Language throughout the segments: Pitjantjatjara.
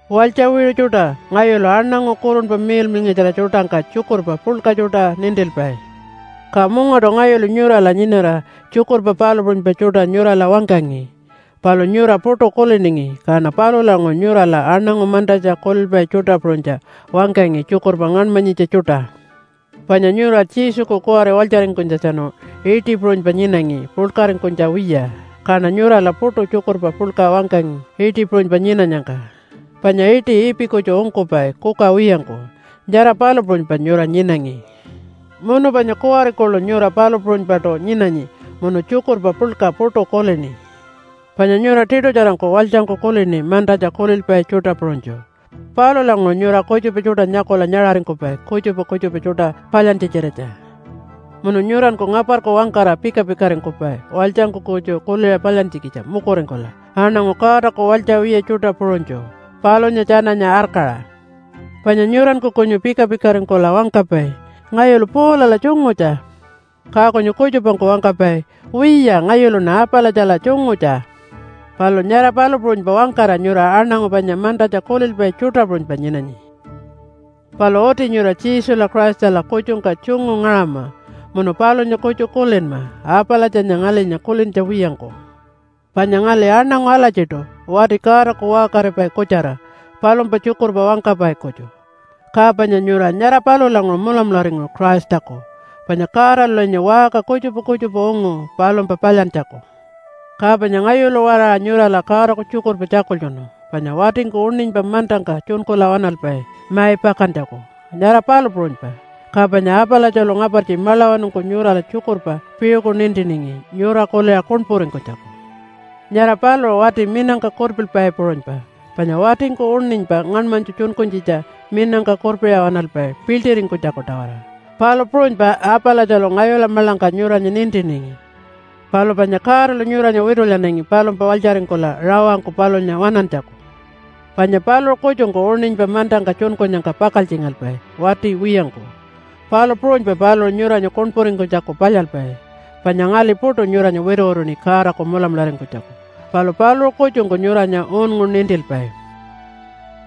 Walytja wiṟu tjuṯa. Ngayulu aṉangu Kurunpa Miḻmiḻngatjara tjuṯangka tjukurpa puḻka tjuṯa nintilpai. Ka mungaṯu ngayulu nyurala nyinara tjukurpa palu puṟunypa tjuṯa nyurala wangkangi, palu nyura puṯu kuliningi. Kaṉa palulanguṟu nyurala aṉangu mantatja kulilpai tjuṯa puṟunytja wangkangi tjukurpa ngaṉmanyitja tjuṯa. Panya nyura Jesuku kuwari walytjaringkunytjatjanu iṯi puṟunypa nyinangi puḻkaringkunytja wiya, kaṉa nyurala puṯu tjukurpa puḻka wangkangi iṯi puṟunypa nyinanyangka, panya iṯi ipi kutju ungkupai kuka wiyangku, nyara palu puṟunypa nyura nyinangi. Munu panya kuwari kuḻu nyura palu puṟunypaṯu nyinanyi munu tjukurpa puḻka puṯu kulini. Panya nyura tiṯutjarangku walytjangku kulini mantatja kulilpai tjuṯa puṟunytju. Palulanguṟu nyura kutjupa tjuṯa nyakula nyaṟaringkupai kutjupa kutjupa tjuṯa palyantja-tjiratja. Munu nyuranku ngaparku wangkara pika-pikaringkupai walytjangku kutju kuliṟa palyantjikitja mukuringkula aṉangu Godaku walytja wiya tjuṯa puṟunytju, palunya tjananya arkaṟa. Panya nyuranku kunyu pika-pikaringkula wangkapai, “Ngayulu Paulala tjungutja.” Ka kunyu kutjupangku wangkapai, “Wiya, ngayuluṉa Apalatjala tjungutja.” Palu nyara palu puṟunypa wangkara nyura aṉangu panya mantatja kulilpai tjuṯa puṟunypa nyinanyi. Palu uti nyura Jesula Christala kutjungka tjungu ngaṟama munu palunya kutju kulinma, Apalatjanya ngalinya kulintja wiyangku. Panya ngali aṉangu alatjiṯu wati Godaku waṟkaripai kutjara palumpa tjukurpa wangkapai kutju, ka panya nyura nyara palulanguṟu mulamularingu Christaku. Panya Godalulinya waṟka kutjupa kutjupa ungu palumpa palyantjaku. Ka panya ngayulu-waraṟa nyurala Godaku tjukurpa tjakultjunu, panya watingku uṉinypa mantangka tjunkula waṉalpai mai pakantjaku, nyara palu puṟunypa. Ka panya Apalatjalu ngapartji maḻawanungku nyurala tjukurpa piṟuku nintiningi nyura kuliṟa kuṉpuringkunytjaku. Nyara paluṟu wati minangka kurpilpai puṟunypa, panya watingku uṉinypa ngaṉmanytju tjunkunytjitja minangka kurpiṟa waṉalpai piḻṯiringkunytjaku-tawara, palu puṟunypa Apalatjalu ngayula maḻangka nyuranya nintiningi. Palu panya Godalu nyuranya witulyanangi palumpa walytjaringkula rawangku palunya waṉantjaku. Panya paluṟu kutjungku uṉinypa mantangka tjunkunyangka pakaltjingalpai wati wiyangku, palu puṟunypa paluṟu nyuranya kuṉpuringkunytjaku palyalpai. Panya ngali puṯu nyuranya wituwituṉi Godaku mulamularingkunytjaku, palu paluṟu kutjungku nyuranya unngu nintilpai.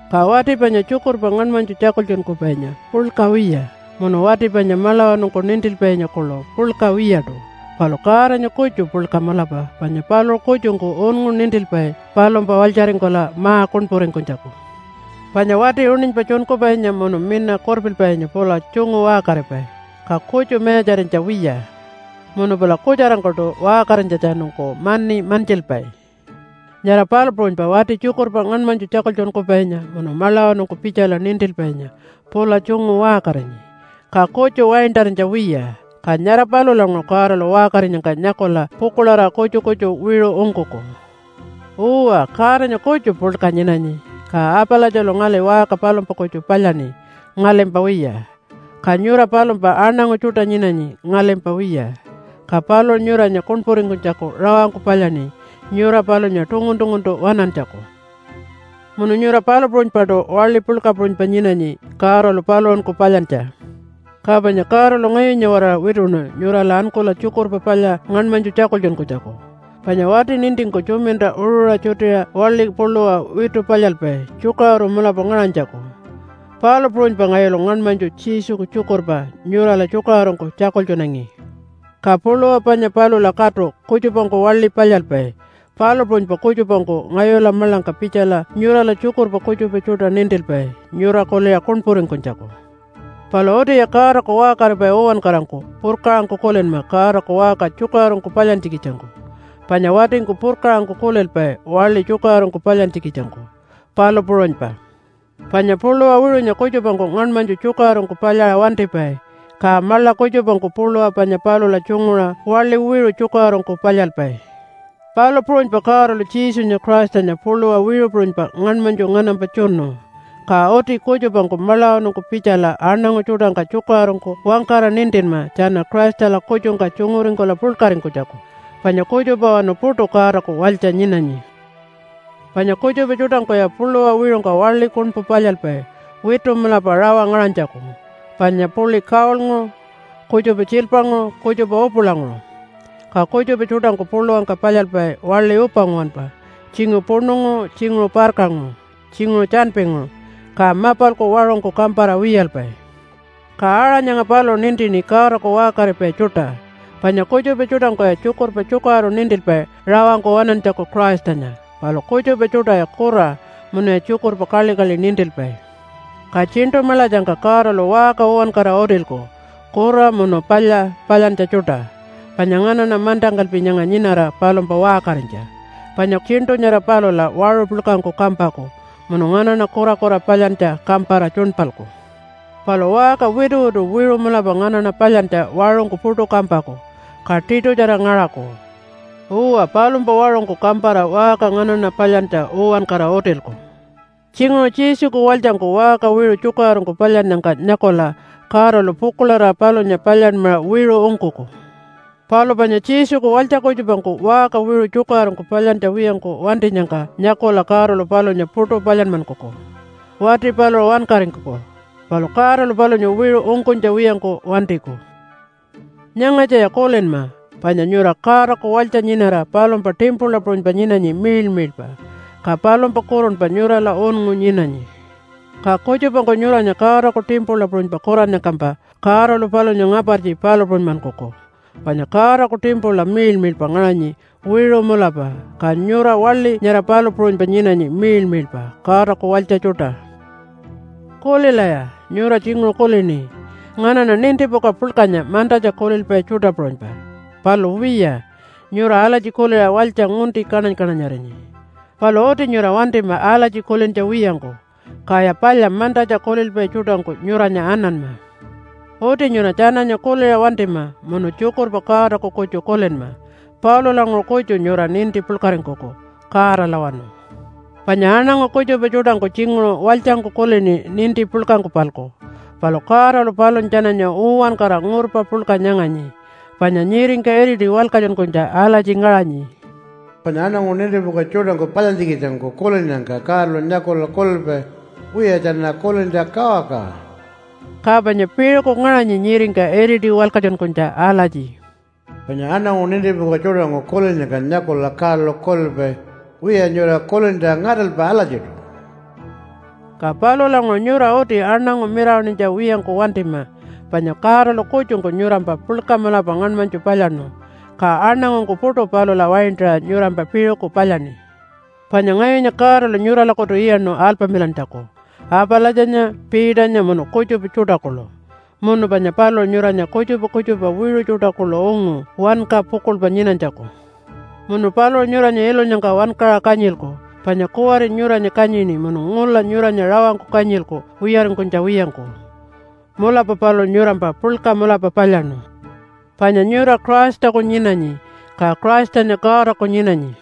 Ka wati panya tjukurpa ngaṉmanytju tjakultjunkupainya puḻka wiya, munu wati panya maḻawanungku nintilpainya kuḻu puḻka wiyaṯu. Palu Godanya kutju puḻka mulapa panya paluṟu kutjungku unngu nintilpai palumpa walytjaringkula ma-kuṉpuringkunytjaku. Panya wati uṉinypa tjunkupainya munu minangka kurpilpainya pula tjungu waṟkaripai, ka kutju mayatjarinytja wiya. Munu pula kutjarangkuṯu waṟkarinytjatjanungku mani mantjilpai. Nyara palu puṟunypa wati tjukurpa ngaṉmanytju tjakultjunkupainya munu maḻawanungku pitjala nintilpainya pula tjungu waṟkarinyi, ka kutju waintarinytja wiya. Ka nyara palulanguṟu Godalu waṟkarinyangka nyakula pukuḻarira kutju kutju wiṟu ungkuku. Uwa, Godanya kutju puḻka nyinanyi, ka Apalatjalu ngali waṟka palumpa kutju palyaṉi ngalimpa wiya. Ka nyura palumpa aṉangu tjuṯa nyinanyi ngalimpa wiya, ka paluṟu nyuranya kuṉpuringkunytjaku rawangku palyaṉi nyura palunya tungun-tunguntu waṉantjaku. Munu nyura palu puṟunypaṯu waḻi puḻka puṟunypa nyinanyi Godalu paluṟunku palyantja. Ka panya Godalu ngayunya-waraṟa wituṉu nyurala ankula Tjukurpa Palya ngaṉmanytju tjakultjunkunytjaku. Panya wati nintingku tjuminta uṟuṟa tjutiṟa waḻiku puluwa witu palyalpai tjukaṟuru mulapa ngaṟanytjaku, palu puṟunypa ngayulu ngaṉmanytju Jesuku tjukurpa nyurala tjukaṟurungku tjakultjunangi. Ka puluwa panya palula katu kutjupangku waḻi palyalpai, palu puṟunypa kutjupangku ngayula maḻangka pitjala nyurala tjukurpa kutjupa tjuṯa nintilpai nyura kuliṟa kuṉpuringkunytjaku. Palu utiya Godaku waṟkaripai uwankarangku purkaṟangku kulinma Godaku waṟka tjukaṟurungku palyantjikitjangku, panya watingku purkaṟangku kulilpai waḻi tjukaṟurungku palyantjikitjangku, palu puṟunypa. Panya puluwa wiṟunya kutjupangku ngaṉmanytju tjukaṟurungku palyaṟa wantipai, ka maḻa kutjupangku puluwa panya palula tjunguṟa waḻi wiṟu tjukaṟurungku palyalpai. Palu puṟunypa Godalu Jesunya Christanya puluwa wiṟu puṟunypa ngaṉmanytju nganampa tjunu, ka uti kutjupangku maḻawanungku pitjala aṉangu tjuṯangka tjukaṟurungku wangkara nintinma tjana Christala kutjungka tjunguringkula puḻkaringkunytjaku. Panya kutjupawanu puṯu Godaku walytja nyinanyi. Panya kutjupa tjuṯangkuya puluwa wiṟungka waḻi kuṉpu palyalpai witu mulapa rawa ngaṟanytjaku, panya puḻi gold-nguṟu, kutjupa tjiilpanguṟu, kutjupa upulanguṟu. Ka kutjupa tjuṯangku puluwangka palyalpai waḻi upa nguwanpa tjinguṟu puṉunguṟu, tjinguṟu parkanguṟu, tjinguṟu tjanpinguṟu, ka mapalku waṟungku kampara wiyalpai. Ka aṟa nyanga paluṟu nintini Godaku waṟkaripai tjuṯa, panya kutjupa tjuṯangkuya tjukurpa tjukaṟuru nintilpai rawangku waṉantjaku Christanya, palu kutjupa tjuṯaya kura munuya tjukurpa kaḻikaḻi nintilpai. Ka tjiṉṯu maḻatjangka Godalu waṟka uwankara utilku kura munu palya palyantja tjuṯa, panya nganaṉa mantangkalpi nyanga nyinara palumpa waṟkarinytja. Panya tjiṉṯu nyara palula waṟu puḻkangku kampaku munu nganaṉa kurakura palyantja kampara tjuṉpalku. Palu waṟka wituwitu wiṟu mulapa nganaṉa palyantja waṟungku puṯu kampaku, ka tiṯutjara ngaṟaku. Uwa, palumpa waṟungku kampara waṟka nganaṉa palyantja uwankara utilku. Tjinguṟu Jesuku walytjangku waṟka wiṟu tjukaṟurungku palyannyangka nyakula Godalu pukuḻarira palunya palyanmaṟa wiṟu ungkuku. Palu panya Jesuku walytja kutjupangku waṟka wiṟu tjukaṟurungku palyantja wiyangku wantinyangka nyakula Godalu palunya puṯu palyanmankuku. Wati paluṟu wankaringkuku, palu Godalu palunya wiṟu ungkunytja wiyangku wantiku. Nyangatjaya kulinma, panya nyura Godaku walytja nyinara palumpa timpula puṟunypa nyinanyi miḻmiḻpa, ka palumpa kurunpa nyurala unngu nyinanyi. Ka kutjupangku nyuranya Godaku timpula puṟunypa kurannyangkampa, Godalu palunya ngapartji palu puṟunymankuku. Panya Godaku timpula miḻmiḻpa ngaṟanyi wiṟu mulapa, ka nyura waḻi nyara palu puṟunypa nyinanyi miḻmiḻpa, Godaku walytja tjuṯa. Kulilaya! Nyura tjinguṟu kulini, “Nganaṉa nintipuka puḻkanya mantatja kulilpai tjuṯa puṟunypa.” Palu wiya, nyura alatji kuliṟa walytja ngunti kaṉany-kaṉanyarinyi. Palu uti nyura wantima alatji kulintja wiyangku, kaya palya mantatja kulilpai tjuṯangku nyuranya ananma. Uti nyura tjananya kuliṟa wantima munu tjukurpa Godaku kutju kulinma. Palulanguṟu kutju nyura ninti puḻkaringkuku, Godalawanu. Panya aṉangu kutjupa tjuṯangku tjinguṟu walytjangku kulini ninti puḻkangku-palku, palu Godalu palunya tjananya uwankara ngurpa puḻka nyanganyi. Panya nyiringka iriti walkatjunkunytja alatji ngaṟanyi, “Panya aṉangu nintipuka tjuṯangku palyantjikitjangku kulinnyangka Godalu nyakula kulilpai, ‘Wiya, tjana kulintja kawakawa.’” Ka panya piṟuku ngaṟanyi nyiringka iriti walkatjunkunytja alatji, “Panya aṉangu nintipuka tjuṯangku kulinnyangka nyakula Godalu kulilpai, ‘Wiya, nyura kulintja ngaṯalpa alatjiṯu.’” Ka palulanguṟu nyura uti aṉangu mirawaṉinytja wiyangku wantima. Panya Godalu kutjungku nyurampa puḻka mulapa ngaṉmanytju palyaṉu, ka aṉangungku puṯu palula waintarira nyurampa piṟuku palyaṉi. Panya ngayunya Godalu nyuralakutu iyaṉu alpamilantjaku, Apalatjanya, Peternya munu kutjupa tjuṯa kuḻu. Munu panya paluṟu nyuranya kutjupa kutjupa wiṟu tjuṯa kuḻu ungu wanka pukuḻpa nyinanytjaku. Munu paluṟu nyuranya ilunyangka wankaṟa kanyilku. Panya kuwari nyuranya kanyini munu ngula nyuranya rawangkuṯu kanyilku wiyaringkunytja wiyangku. Mulapa paluṟu nyurampa puḻka mulapa palyaṉu. Panya nyura Christaku nyinanyi, ka Christanya Godaku nyinanyi.